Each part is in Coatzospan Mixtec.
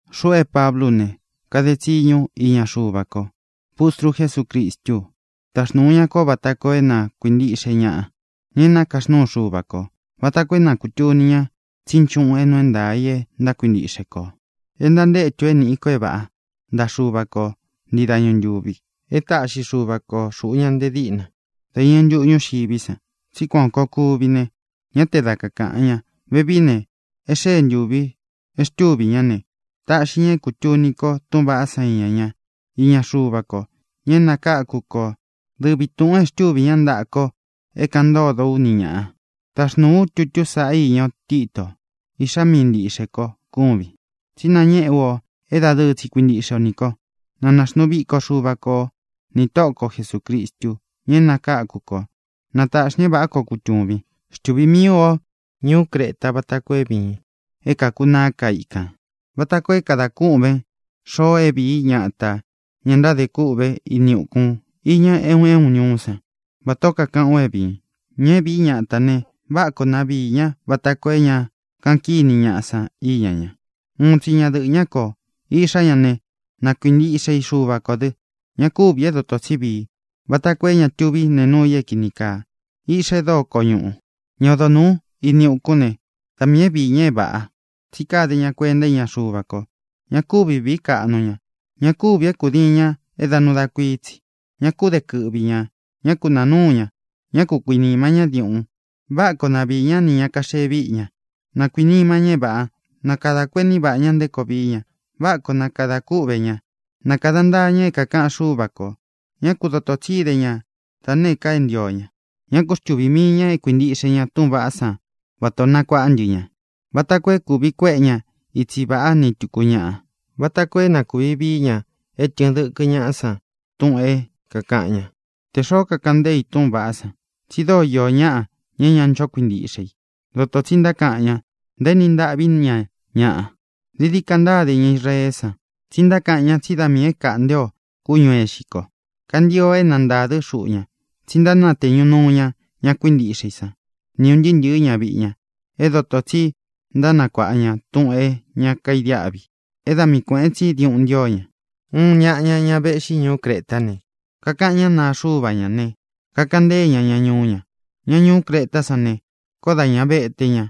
Xuꞌu é Pablú u ne, kade tsiñu ú iña Xuva ko; pustru Jesúcristú u. Taxnūu ña kó vata koo é na kuīntiꞌxe ñaꞌa, ña é nakaxnúu Xuva kō, vata koo é na kūtuni ña tsí nchuꞌun é nuu é ntaā i e ntákuintiꞌxe kō, e ntantétu ō é nīꞌi ko é vāꞌá ntaꞌa Xuva ko ntii dañu ntūvi. E táꞌxi Xuva ko xūꞌu ña nte díꞌna dá iñɨ ntuꞌu ñúxiví san tsí kuān koo kuvi ne, ñá te da kakāꞌan ña. Vevií ne, e xée ntūvi e xtúvī ñá ne, tāꞌxi ña é kūtuni ko túꞌūn vaꞌá san iña ña, iña Xuva ko, ña é nakáku kō, dɨvi tūꞌun e xtúvī ñá ntaꞌa ko é kāꞌan ntódo ú ni ñāꞌa. Taxnūu ú tutu sáꞌa īña o, Tito. Iꞌxá mii ntīꞌxe ko kúvin, tsí nañéꞌe ú o é dadɨɨ tsi kuintiꞌxe o nī ko. Na naxnuu viko Xuva kō ó, nī Tóꞌo ko Jesūcristu, ña é nakáku kō; na tāꞌxi ña é vāꞌá koo kutūvin. Xtuvī míi ú o ñuú Creta vata koo é vīin é kākunaá ka ikān, vata koo é kadā kûꞌvén xoo é viī í ñatā ña ntádē kûꞌvé ini ukun iña é un é un ñuú san vatā ó kakaꞌán u é vīin. Ña é vīí ñatā ne, váꞌa koo na viī ñá vata koo é ña kaꞌan kíni ñaꞌa san íña ña. Uun tsi ñadɨꞌɨ̄ ñá koo. Iꞌxá ña ne, na kuintiꞌxe i Xuva kō dɨ; ña kúvī é dotō tsí vii, vata koo é ña tuví nēe núu i é kīni kaa; iꞌxa e dóo koñuꞌū. Ña odo nūú ini ukún ne, da miī é viī ña é vāꞌa, tsí kade ña kuenta íña Xuva ko. Ña kúvi vīí kaꞌnu ña. Ña kúvī é kūdiin ña é da nuu da kuií tsi. Ñá ku de kɨꞌvi ñā. Ñá ku nāa núu ña. Ñá ku kuīnima ñá diuꞌun. Váꞌa koo na viī ñá nī ña kaxee víꞌi ña. Na kuīnima ña é vāꞌa. Na kadā kuení vaꞌā ñá nté koo vií ña. Váꞌa koo na kadā kúꞌvē ña. Na kāda ntaa ña é kākaꞌan Xúva kō. Ñá ku dotō tsi íde ña da nēé ka é ntio ña. Ñá ku xtuvī mii ña é kuīntiꞌxe ña túꞌūn vaꞌá san vatā o nakuaꞌá ntɨ ña, vata koo é kūvi kuéꞌe ña itsi vāꞌá ni tūku ñaꞌa, vata koo é na kūvi vií ña é tɨ̄ɨn dɨkɨ ñáꞌa san túꞌūn é kākaꞌan ñá, tē xoó kakaꞌan ntée i túꞌūn vaꞌá san. Tsi dóo īó ñaꞌa, ña é ña ncho kuintiꞌxe i. Dotō tsi ntákaꞌan ñá, ntaéni ntaꞌví ña ñaꞌa. Dií dií ka ntáde ña Israeé san, tsí ntákaꞌan ña tsí da miī é kāꞌnte o kúñū é ixi ko. Kantio é na ntādɨ́ xuꞌu ña, tsi ntánateñu núu ña ña kuíntiꞌxe i san ni ūn ntɨɨ́ ntɨ̄ɨ́ ñaviꞌi ña é dotō tsí ntánakuāꞌa ña túꞌūn é ña kaidiáꞌvi é da mii kuēꞌen tsí diuꞌun ntío ña. Uun ñaꞌa ña, ña véꞌxi ñuú Cretá ne, kakaꞌan ñá naa xuva ñá ne, kakaꞌan ntée ña ña ñuú ña: “Ña ñuú Cretá san ne, koó dā ña vete ña.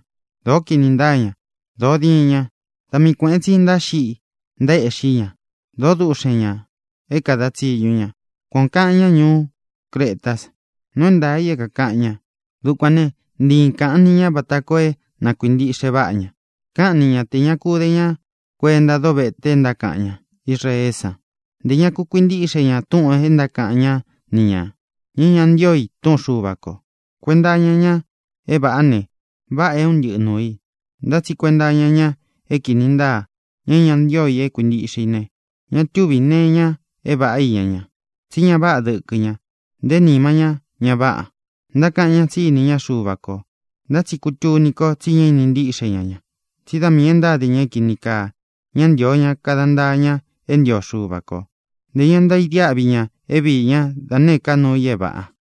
Dōó kinī ntáa ña. Dōo diin ña. Da mii kuēꞌen tsi ntáxiꞌi ntaéꞌxi ña. Dōó duꞌxen ñā é kāda tsiñu ña.” Kuan ō kaꞌan ñá ñuú Cretá san. Nuu é ntaā i é kākaꞌan ña. Dukuān né, ntii kāꞌan ni ña vata koo é na kuīntiꞌxe váꞌa ña. Káꞌan ni ña tē ña ku de ña kuénta dovete e ntákaꞌan ña Israeé san, ntē ña ku kuintíꞌxe ña túꞌūn e ntákaꞌan ñáꞌa ni ñā, ña é ña ntío i túꞌun Xuva kō. Kuenta iña ña é vāꞌá ne, váꞌā é un ntɨꞌɨ nuū i. Ntá tsi kuenta iña ña é kīni ntáa, ña é ña ntío i é kuīntiꞌxe i ne, ña túvī nee iña é vāꞌá iña ña. Tsí ña váꞌa dɨkɨ ña; nté nima ñá ña váꞌa. Ntákaꞌan ña tsí ini ñá Xuva kō, ntá tsi kútuni ko tsi ñá ini ntíꞌxe ña ña, tsí da miī e ntáde ña é kīni kaa. Ñá ntīo ña kada ntaa ña é ntio Xuva kō; ntē ña ntaidiáꞌvi ña é viī ñá da nēé ka nuu i é vāꞌa.